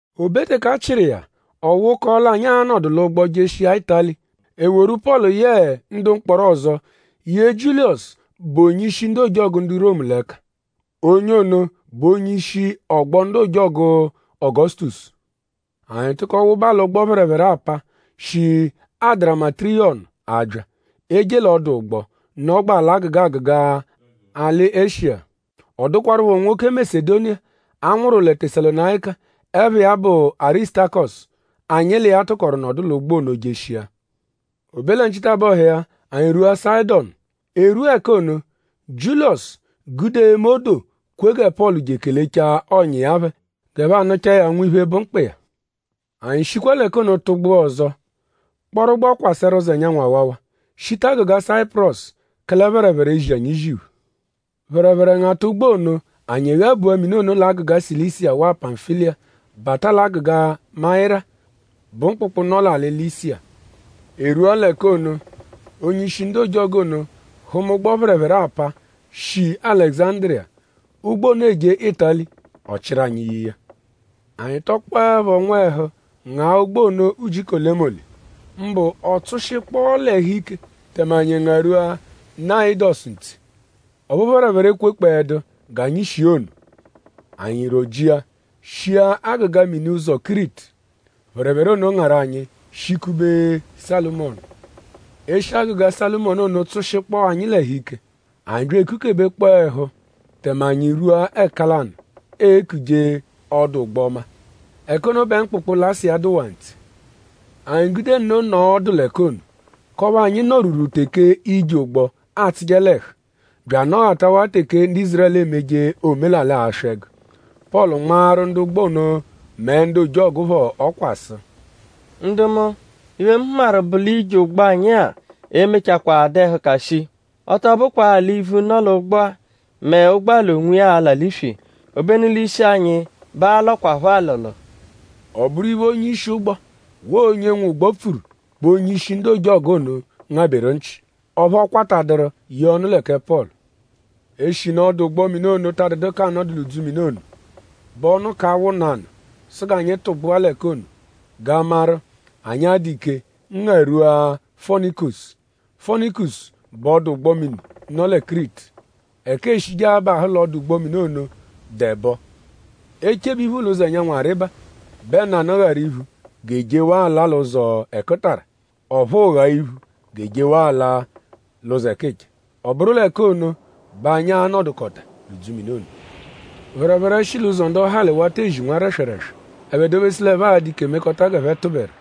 O be teke a chịru iya; ọ wụkoo l'anyi a-nọdu l'ụgbo jeshia Ịtali; e woru Pọlu yẹe ndu mkpọro ọzo ye Jiuliyọsu, bụ onye-ishi ndu ojọgu ndu Romu l'ẹka. Onye ono bụ onye-ishi “Ọgbo ndu ojọgu Ọgosutosu.” Anyi tụko wụba l'ụgbo-phẹrephere-apa, shi Adaramitiyọmu abya; eje l'ọdu ụgbo, nọgbaa l'agụga agụga alị Eshiya. Ọ dụkwarupho nwoke Masedoniya, a nwụru lẹ Tesalonayika, ẹpha iya bụ Arisutakọsu, anyi l'iya tụkoru nọdu l'ụgbo ono jeshia. O be lẹ nchitabọhu iya; anyi rwua Sayịdonu. E rwua ẹka ono; Jiuliyọsu gude eme odoo kwe gẹ Pọlu je ekelechaa ọ̀nyà iya phẹ g'ẹphe anụchaa ya nwiphe, bụ mkpa iya. Anyi shikwa l'ẹka ono tụgbua ọzo; kpọru ụgbo kwasẹru ụzo ẹnyanwu awawa; shita agụga Sayipurọsu; kẹle phẹrephere ezi anyi iziphu. Phẹrephere ngata ụgbo ono anyi ghabua mini ono l'agụga Silisiya waa Pamfiliya bata l'agụga Mayira, bụ mkpụkpu, nọ l'alị Lisiya. E rwua l'ẹka ono; onye-ishi ndu ojọgu ono hụma ụgbo-phẹrephere-apa, shi Alẹguzandiriya. Ụgbo ono eje Ịtali. Ọ chịru anyi ye iya. Anyi tọkpoepho nwẹhu ngaa ụgbo ono ujiku olemole; mbụ ọ tsụshikpoo l'ẹhu ike tẹme anyi ngarwua Knayidọsu ntse. Ọphu phẹrephere ekwekpọedu g'anyi shia ono. Anyi rọ-jia shia agụga mini ụzo Kiritu. Phẹrephere ono ngarụ anyi shikube Salụmonu. Eshi agụga Salụmonu ono tsụshikpoo anyi l'ẹhu ike. Anyi bya ekukebekpọo ẹhu tẹme anyi rwua ẹka lanụ, eekuje “Ọdu-ụgbo-ọma”; ẹka ono bẹ mkpụkpu Lasiya dụwaa ntse. Anyi gude nno nọo ọdu l'ẹka ono k'ọphu anyi nọ-rwuru teke ije ụgbo atsụje l'ẹhu bya anọghatawaa teke ndu Ízurẹlu emeje omelalị aswị ẹgu. Pọlu nmaaru ndu ụgbo ono mẹ ndu ojọgu phọ ọkwa sụ: “Ndu mu; iphe, mu hụmaru bụ l'ije ụgbo anyi-a e-mechakwaa dụ ẹhuka shii. Ọ tọ bụkwaa l'ivu, nọ l'ụgbo-a mẹ ụgbo l'onwiya a-la l'iswi; obenu l'ishi anyi bẹ aa-lọkwapho alọlo.” Ọ bụru iphe, onye-ishi ụgbo waa onye nwe ụgbo pfuru bẹ onye-ishi ndu ojọgu ono ngabẹru nchị. Ọphu ọ kwataduru yee ọnu lẹ kẹ Pọlu. Eshinu ọdu-ụgbo-mini ono ta dụdu k'anọdu l'udzumini ono; bẹ ọnu ka awụ nanụ sụ g'anyi tụgbua l'ẹka ono g'a maru?anyi a-dụ ike ngarwua Fonikusu. Fonikusu bụ ọdu-ụgbo-mini, nọ lẹ Kiritu. Ẹka eeshije abahụ l'ọdu-ụgbo-mini ono dụ ẹbo. E -chebe iphu l'ụzo ẹnyanwu arịba bẹ nanụ gharụ iphu g'e jewaa ala l'ụzo ẹkutara; ọphuu gha iphu g'e jewaa ala l'ụzo ẹkicha. Ọ bụru l'ẹka ono bẹ anyi a-nọdukota l'udzumini ono. Phẹrephere shi l'ụzo ndọhali wata ezi nwa rẹswereswe; ẹphe dobesu l'ẹphe a-dụ ike mekọta g'ẹphe tụberu.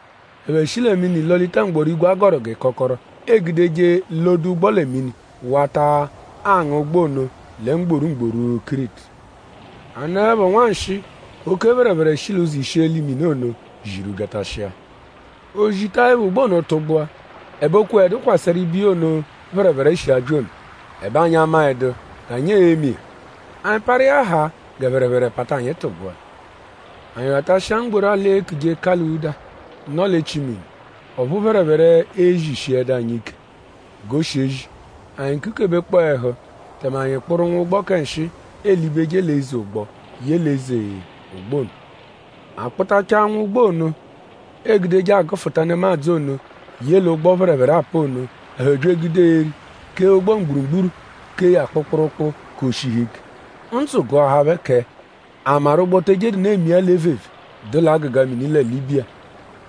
Ẹphe shi lẹ mini lọ-lita mgbọrígwè, a gọru g'ịkokoro, eegudeje lọ-de ụgbo lẹ mini wata anga ụgbo ono lẹ mgboru mgboru Kiritu. A nọepho nwanshịi; oke phẹrephere shi l'ụzo isheli mini ono ziru byatashia. O zikọtaepho ụgbo ono tụgbua; ẹbe o kweẹdu kwasẹru ibiya ono, phẹrephere shi abya ono. Ẹbe anyi amaẹdu g'anyi e-me iya; anyi parụ iya haa gẹ phẹrephere pata anyi tụgbua. Anyi ghatashia mgboru alị, eekuje Kulawuda, nọ l'echi mini; ọphu phẹrephere ezishiẹdu anyi ike g'o shi ezi. Anyi kukebekpọo ẹhu; tẹme anyi kpụru nwụgbo kẹ nshịi, eelibeje l'eze ụgbo ye l'eze ụgbo ono. A kpụbatachaa nwụgbo ono, eegudeje agụfuta nemadzụ ono ye l'ụgbo phẹrephere apa ono; ẹphe bya egude eri kee ụgbo mgburugburu kee ya kpụkpurukpu g'o shihu ike. Ndzụ gụahaa phẹ kẹ:?a maru ụgbo te ejedu nụ emia l'evevee, dụ l'agụga mini lẹ Libiya.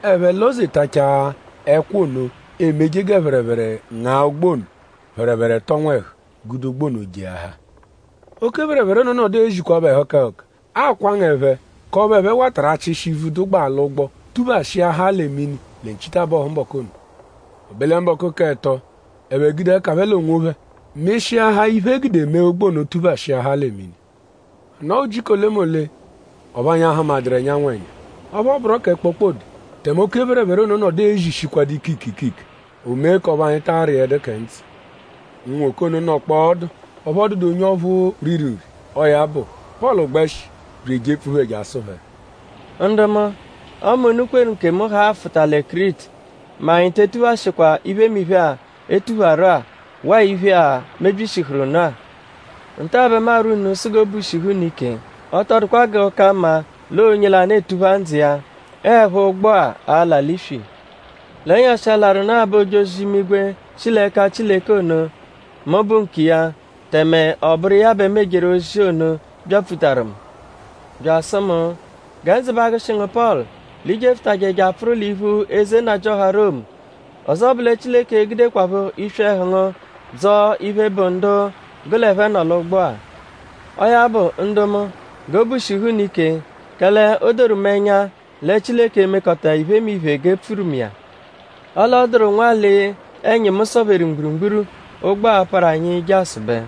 Ẹphe lọ-zetachaa ẹkwa ono, emeje gẹ phẹrephere nga ụgbo ono; phẹrephere tọ nwẹhu gude ụgbo ono jeahaa. Oke phẹrephere ono nọdu ezikwaphọ ẹhuka ẹhuka akwanga ẹphe k'ọphu ẹphe watarụ achịshi ivu, dụ l'ụgbo tuphashiahaa lẹ mini lẹ nchitabọhu mbọku ono. O be lẹ mbọku k'ẹto; ẹphe gude ẹka phẹ l'onwophẹ mịshiahaa iphe, e gude mee ụgbo ono tuphashiahaa lẹ mini. A nọo ujiku olemole ọphu anyi ahụmaduru ẹnyanwu ẹnya; ọphu ọ bụro kẹ kpokpode tẹme oke phẹrephere ono nọdu ezishikwadụ ikike ikike; o mee k'ọphu anyi ta arịedu kẹ ndzụ. Unwoke ono nọkpoo ọdu; ọphu ọ dụdu onye ọphu riru nri. Ọo ya bụ; Pọlu gbẹshi bya ejepfu phẹ je asụ phẹ: “Ndu mu; ọme unu kweru nkemu haa afụta lẹ Kiritu mẹ anyi te etuphashịkwa iphemiphe-a, e tupharu-a waa iphe-a, mebyishihuru nụ-a. Nta-a bẹ mu arwọ unu sụ g'obu shihu unu ike. Ọ tọ dụkwa g'ọ ka mma l'ọo onye lanụ, etupha ndzụ iya. Ọo 'ẹpho ụgbo-a a-la l'iswi. L'ẹnyashi-a, larụ nụ-a bẹ ojozi-imigwe, shi l'ẹka Chileke ono, mu bụ nkiya; tẹme ọ bụru iya bẹ mu ejeru ozi ono byapfutaru mu; bya asụ mu: ‘Gẹ ndzụ ba agụshi ngu Pọlu l'i jefụtaje je apfụru l'iphu eze nnajịoha Romu. Ọzo bụ lẹ Chileke e-gudekwaphọ iswi ẹhu ngu dzọo iphe, bụ ndu gụ l'ẹphe nọ l'ụgbo-a.’ Ọo ya bụ; ndu mu; g'obu shihu unu ike; kẹle o doru mu ẹnya lẹ Chileke e-mekọta iphemiphe g'e pfuru mu iya. Ọle ọ dụru nwalị, ẹnyimu sọ-pheru mgburugburu, ụgbo-a a-parụ anyi je asụbe.”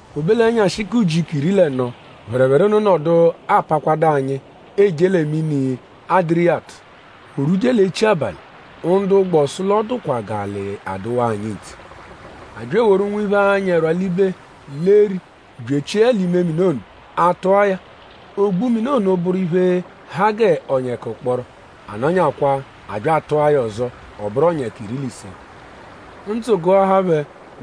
O be l'ẹnyashi k'ujiku iri l'ẹno; phẹrephere ono nọdu apakwadụ-a anyi eje lẹ mini Adiriyatu. O rwuje l'echi abalị; ndu ụgbo sụ l'ọ dụkwa g'alị adụwaa anyi ntse. A bya eworu nwiphe, anyị ẹrwa libe l'eri bya echie ya l'ime mini ono. A tụ̀á ya; ogbu mini ono bụru iphe, ha gẹ ọnyeka ụkporo. A nọnyakwa; a bya atụa ya ọzo; ọ bụru ọnyeka iri l'ise. Ndzụ gụahaa phẹ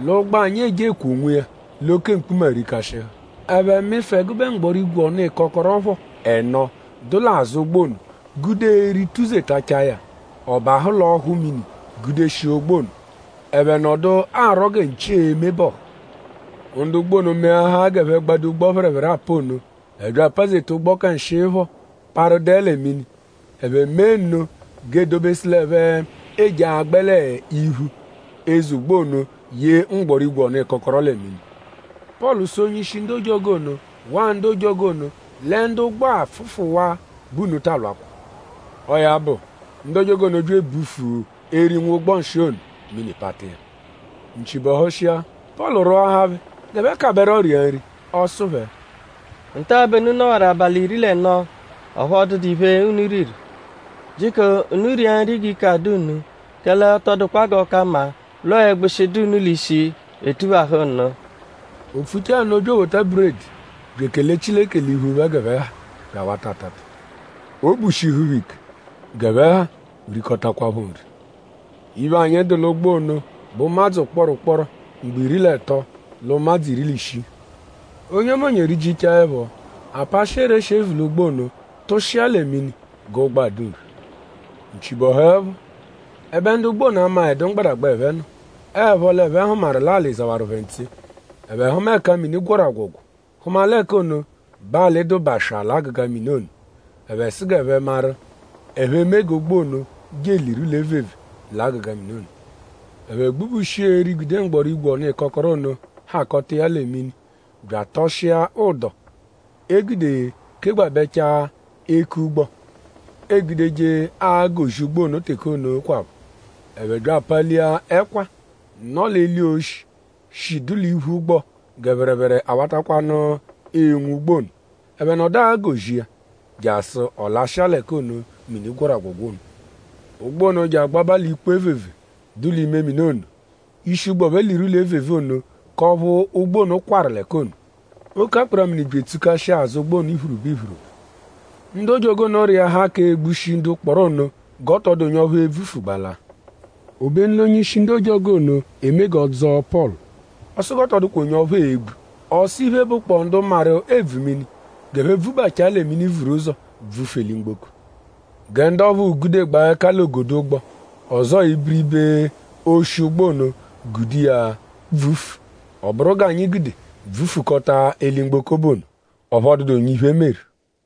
l'ụgbo anyi e-je ekwoo onwiya l'oke mkpuma rikashịhu. Ẹphe mịfu ẹgube mgbọrígwè-ọnu-ịkokoro phọ ẹno, dụ l'azụ ụgbo ono gude eri tụ-zetachaa ya; ọ bahụ l'ọhu mini gudeshia ụgbo ono. Ẹphe nọdu arwọ gẹ nchi e-me bọhu. Ndu ụgbo ono meahaa g'ẹphe gbado ụgbo-phẹrephere-apa ono. Ẹphe bya apazeta ụgbo kẹ nshịi phọ parụ dẹe lẹ mini. Ẹphe mee nno g'e dobesu l'ẹphe eje agbẹ l'iphu eze ụgbo ono ye mgbọrígwè-ọnu-ịkokoro lẹ mini. Pọlu sụ onye-ishi ndu ojọgu ono waa ndu ojọgu ono lẹ ndu ụgbo-a -pfụfuwaa bẹ unu ta alwakwa. Ọo ya bụ; ndu ojọgu ono bya ebufu eri nwụgbo nshịi ono; mini pata iya. Nchi bọhushia; Pọlu rwọahaa phẹ g'ẹphe kabẹro ria nri. Ọ sụ phẹ: “Nta bẹ unu nọwaru abalị iri l'ẹno; ọphu ọ dụdu iphe, unu riru. Jiko unu ria nri g'ike adụ unu; kẹle ọ tọ dụkwa g'ọ ka mma l'ọo ẹgbushi, dụ unu l'ishi, etuphahụ nụ.” O pfuchaa nno bya ewota buredi bya ekele Chileke l'iphu phẹ g'ẹphe ha bya awata atata. Obu shihu phẹ ike. G'ẹphe ha rikọtakwapho nri. Iphe, anyi dụ l'ụgbo ono bụ ụmadzu ụkporo ụkporo mgbo iri l'ẹto l'ụmadzu iri l'ishii. Onyemonye rijichaa ẹpho; a pashịa ereshi, e vu l'ụgbo ono tụshia lẹ mini g'ụgbo a-dụ nphe. Nchi bọhuepho; ẹbe ndu ụgbo ono amaẹdu mgbadagba, ẹphe nọ. Ọo 'ẹpho l'ẹphe hụmaru l'alị zawaru phẹ ntse. Ẹphe hụma ẹka mini gwọru agwọ̀gwò; hụma l'ẹka ono bẹ alị dụ baswaa l'agụga mini ono. Ẹphe sụ g'ẹphe maru?ẹphe e-me g'ụgbo ono je eliru l'evevee l'agụga mini ono. Ẹphe gbubushia eri, gude mgbọrígwè-ọnu-ịkokoro ono hakọta iya lẹ mini bya atọshia ụdo, e gude kegbabẹchaa eku-ụgbo, eegudeje agọ-zi ụgbo ono teke ono kwaphọ. Ẹphe bya apalia ẹkwa, nọ l'eli oshi, shi dụ l'iphu ụgbo gẹ phẹrephere awatakwanụ enwu ụgbo ono. Ẹphe nọdu agọ-zi iya; jasụ ọ lashịa l'ẹka ono, mini gwọru agwọ̀gwò ono. Ụgbo ono je agbaba l'ikpo evevee, dụ l'ime mini ono; ishi ụgbo phẹ liru l'evevee ono k'ọphu ụgbo ono kwarụ l'ẹka ono. Oke akpara-mini bya etsukashia azụ ụgbo ono iphiriba iphiriba. Ndu ojọgu ono rịahaa k'egbushi ndu mkpọro ono g'ọ tọ dụ onye ọphu e-bvufu gbala. Obenu l'onye-ishi ndu ojọgu ono eme g'ọ dzọo Pọlu. Ọ sụ g'ọ tọ dụkwa onye ẹphe e-gbu. Ọ sụ iphe, bụkpoo ndu maru ebvu mini g'ẹphe pfụbachaa lẹ mini vuru ụzo bvufu eli-mgboko. Gẹ ndu ọphuu gudegbaa ẹka l'ogodo ụgbo; ọzoo ibiribe oshi ụgbo ono gude iya bvufu. Ọ bụru g'anyi gude bvufukọta eli-mgboko bụ ono. Ọphu ọ dụdu onye iphe meru.